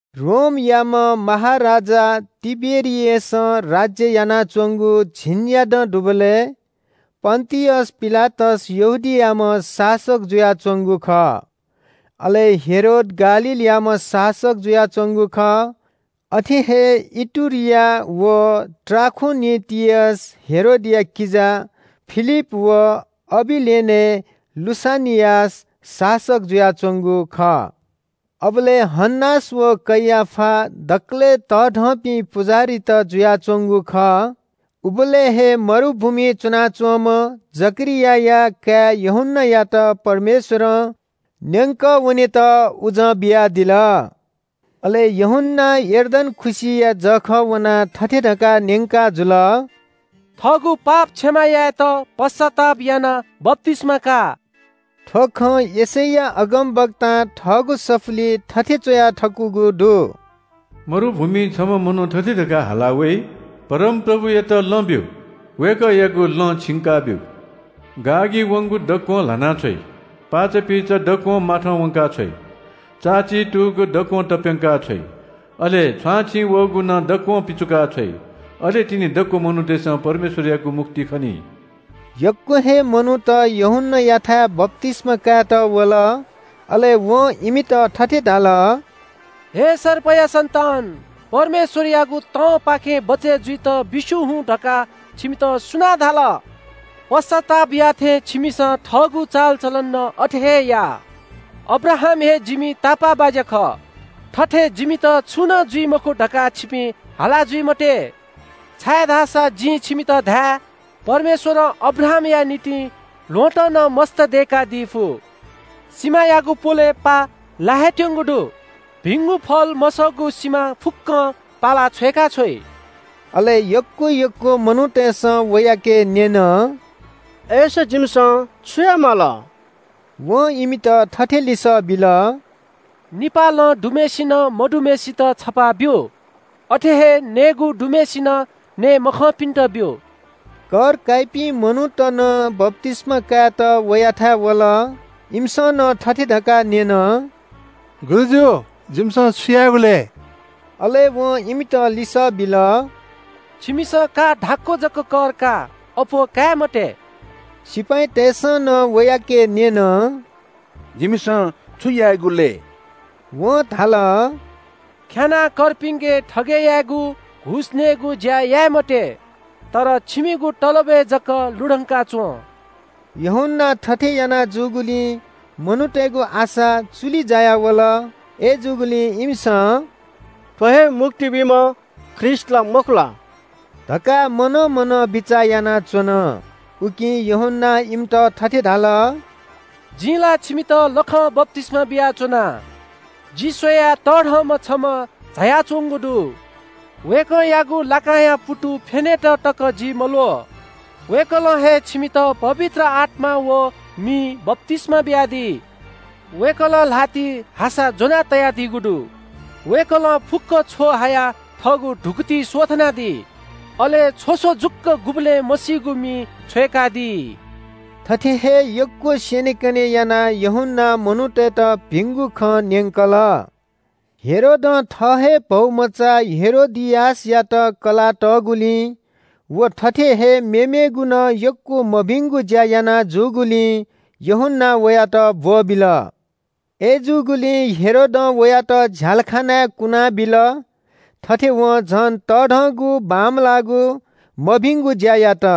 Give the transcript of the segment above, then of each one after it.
रोमयाम्‍ह महाराजा तिबेरिअसं राज्‍य यानाच्‍वंगु झिंन्‍यादँ दुबलय् पन्‍तियस पिलातस यहूदियायाम्‍ह शासक जुयाच्‍वंगु खः। अले हेरोद गालीलयाम्‍ह शासक जुयाच्‍वंगु खः। अथे हे इतुरिया व त्राखोनितिसय् हेरोदया किजा फिलिप व अबिलेनय् लुसानियास शासक जुयाच्‍वंगु खः। अबलय् हन्‍नास व कैयाफा दकलय् तःधंपिं पुजाहारीत जुयाच्‍वंगु खः। उबलय् हे मरुभूमिइ च्‍वनाच्‍वंम्‍ह जकरियाया काय् यूहन्‍नायात परमेश्‍वरं न्‍यंकः वनेत उजं बियादिल। अले यूहन्‍नां यर्दन खुसिया जःखः वनाः थथे धकाः न्‍यंकाजुल – “थःगु पाप क्षमा यायेत पश्‍चाताप यानाः बप्‍तिस्‍मा का।” थ्‍व खँ यशैया अगमवक्तां थःगु सफुलिइ थथे च्‍वया थकूगु दु – “मरुभूमिइ छम्‍ह मनू थथे धकाः हाला वइ – ‘परमप्रभुयात लँ ब्‍यु, वय्‌कःयागु लँ छिंकाब्‍यु। गाःगी वंगु दक्‍वं ल्‍हाना छ्वइ। पाःचापीचा दक्‍वं माथं वंका छ्वइ। चाःची तूगु दक्‍वं तप्‍यंका छ्वइ। अले छ्वांछिं वःगु नं दक्‍वं पिचुका छ्वइ। अले तिनि दक्‍व मनूतय्‌सं परमेश्‍वरयागु मुक्ति खनी।’” यक्‍व हे मनूत यूहन्‍नायाथाय् बप्‍तिस्‍मा कायेत वल। अले वं इमित थथे धाल – “हे सर्पया सन्‍तान, परमेश्‍वरयागु तंपाखें बचय् जुइत बिस्‍युं हुँ धकाः छिमित सुनां धाल? पश्‍चाताप याःथें छिमिसं थःगु चालचलन नं अथे हे या। ‘अब्राहाम हे जिमि तापाःबाज्‍या खः, थथे जिमित छुं नं जुइ मखु’ धकाः छिपिं हाला जुइ मते, छाय्‌धाःसा जिं छिमित धाये – परमेश्‍वरं अब्राहामया निंतिं ल्‍वहँतं नं मस्‍त दय्‌कादी फु। सिमायागु प्‍वलय् पाः लाये हे त्‍यंगु दु। भिंगु फल मसःगु सिमा फुक्‍कं पालाः छ्वय्‌काछ्वइ।” अले यक्‍व यक्‍व मनूतय्‌सं वयाके न्‍यन – “अय्‌सा जिमिसं छु याये माल?” वं इमित थथे लिसः बिल – “निपाः लं दुम्‍हय्‌सिनं मदुम्‍हय्‌सित छपाः ब्‍यु। अथे हे नयेगु दुम्‍हय्‌सिनं नये मखंपिन्‍त ब्‍यु।” कर काइपिं मनूत नं बप्‍तिस्‍मा कायेत वयाथाय् वल। इमिसं नं थथे धकाः न्‍यन – “गुरुजु, जिमिसं छु यायेगु लय्?” अले वं इमित लिसः बिल – “छिमिसं का धाक्‍व जक कर का, अप्‍वः काये मते।” सिपाइँतय्‌सं नं वयाके न्‍यन – “जिमिसं छु यायेगु लय्?” वं धाल – “ख्‍यानाः कर्पिन्‍के थगय् यायेगु, घुस नयेगु ज्‍या याये मते। तर छिमिगु तलबय् जक लुधंका च्‍वँ।” यूहन्‍नां थथे याना जूगुलिं मनूतय्‌गु आशा चुलि जायावल। अय्‌जूगुलिं इमिसं – “थ्‍व हे मुक्ति बीम्‍ह ख्रीष्‍ट ला मखु ला” धकाः मनं मनं बिचाः यानाच्‍वन। उकिं यूहन्‍नां इमित थथे धाल – “जिं ला छिमित लखं बप्‍तिस्‍मा बियाच्‍वना। जि स्‍वयाः तःधंम्‍ह छम्‍ह झायाच्‍वंगु दु। वय्‌कःयागु लाकांया पुतु फ्‍यनेत तकं जि मल्‍वः। वय्‌कलं हे छिमित पवित्र आत्‍मां व मिं बप्‍तिस्‍मा बियादी। वय्‌कलं ल्‍हातिइ हासा ज्‍वना तयादीगु दु। वय्‌कलं फुक्‍क छ्व हायाः थःगु धुकुतिइ स्‍वथनादी। अले छ्वस जुक्‍व गुबलें मसीगु मिइ छ्वय्‌कादी।” थथे हे यक्‍व स्‍यनेकने यानाः यूहन्‍नां मनूतय्‌त भिंगु खँ न्‍यंकल। हेरोदं थः हे भौमचा हेरोदियासयात कलाः तःगुलिं व थथे हे मेमेगु नं यक्‍व मभिंगु ज्‍या याना जूगुलिं यूहन्‍नां वयात ब्‍वःबिल। अय्‌जूगुलिं हेरोदं वयात झ्‍यालखानाय् कुनाबिल। थथे वं झन तःधंगु बांमलाःगु, मभिंगु ज्‍या यात।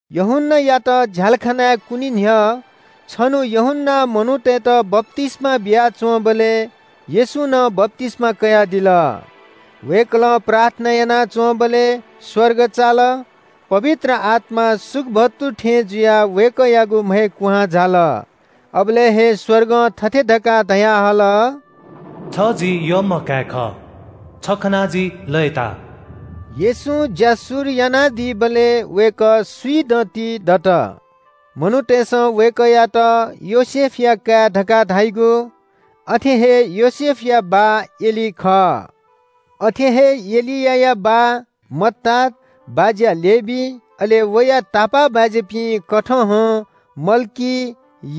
यूहन्‍नायात झ्‍यालखानाय् कुने न्‍ह्यः छन्‍हु यूहन्‍नां मनूतय्‌त बप्‍तिस्‍मा बियाच्‍वंबलय् येशूं नं बप्‍तिस्‍मा कयादिल। वय्‌कलं प्रार्थना यानाच्‍वंबलय् स्‍वर्ग चाल। पवित्र आत्‍मा सुकुभतु थें जुयाः वय्‌कःयागु म्‍हय् कुहां झाल। अबलय् हे स्‍वर्गं थथे धकाः धयाहल – “छ जि यःम्‍ह काय् खः। छ खनाः जि लय्‌ताः।” येशूं ज्‍या शुरु यानादीबलय् वय्‌कः स्‍विदँति दत। मनूतय्‌सं वय्‌कःयात योसेफया काय् धकाः धाइगु। अथे हे योसेफया बाः एली खः। अथे हे एलिया बाः मत्तात, बाज्‍या लेवी, अले वया तापाःबाज्‍यापिं कथहं मल्‍की,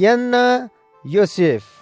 यान्‍ना, योसेफ,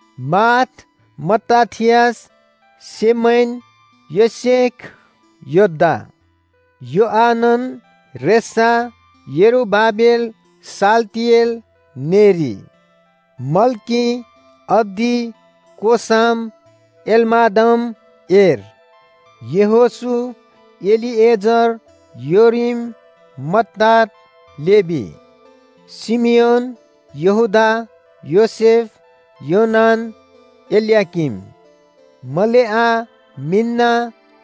माथ, मत्ताथियास, सेमैन, योसेख, योदा, योआनन, रेसा, यरूबाबेल, शालतिएल, नेरी, मल्‍की, अद्दी, कोसाम, एलमादम, एर्, यहोशू, एलीएजर, योरीम, मत्तात, लेवी, शिमियोन, यहूदा, योसेफ, योनान, एल्‍याकीम, मलेआ, मिन्‍ना,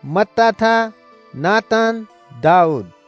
मत्ताथा, नातान, दाऊद,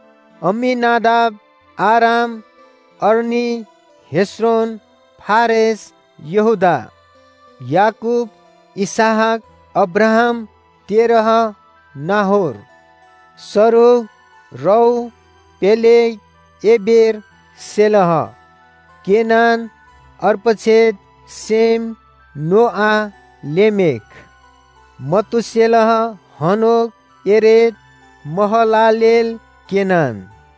अम्‍मीनादाब, आराम, अरनी, हेस्रोन, फारेस, यहूदा, याकूब, इसहाक, अब्राहाम, तेरह, नाहोर, सरूग, रऊ, पेलेग, एबेर, शेलह, केनान, अर्पक्षद, शेम, नोआ, लेमेख, मतूशेलह, हनोक, येरेद, महलालेल, केनान,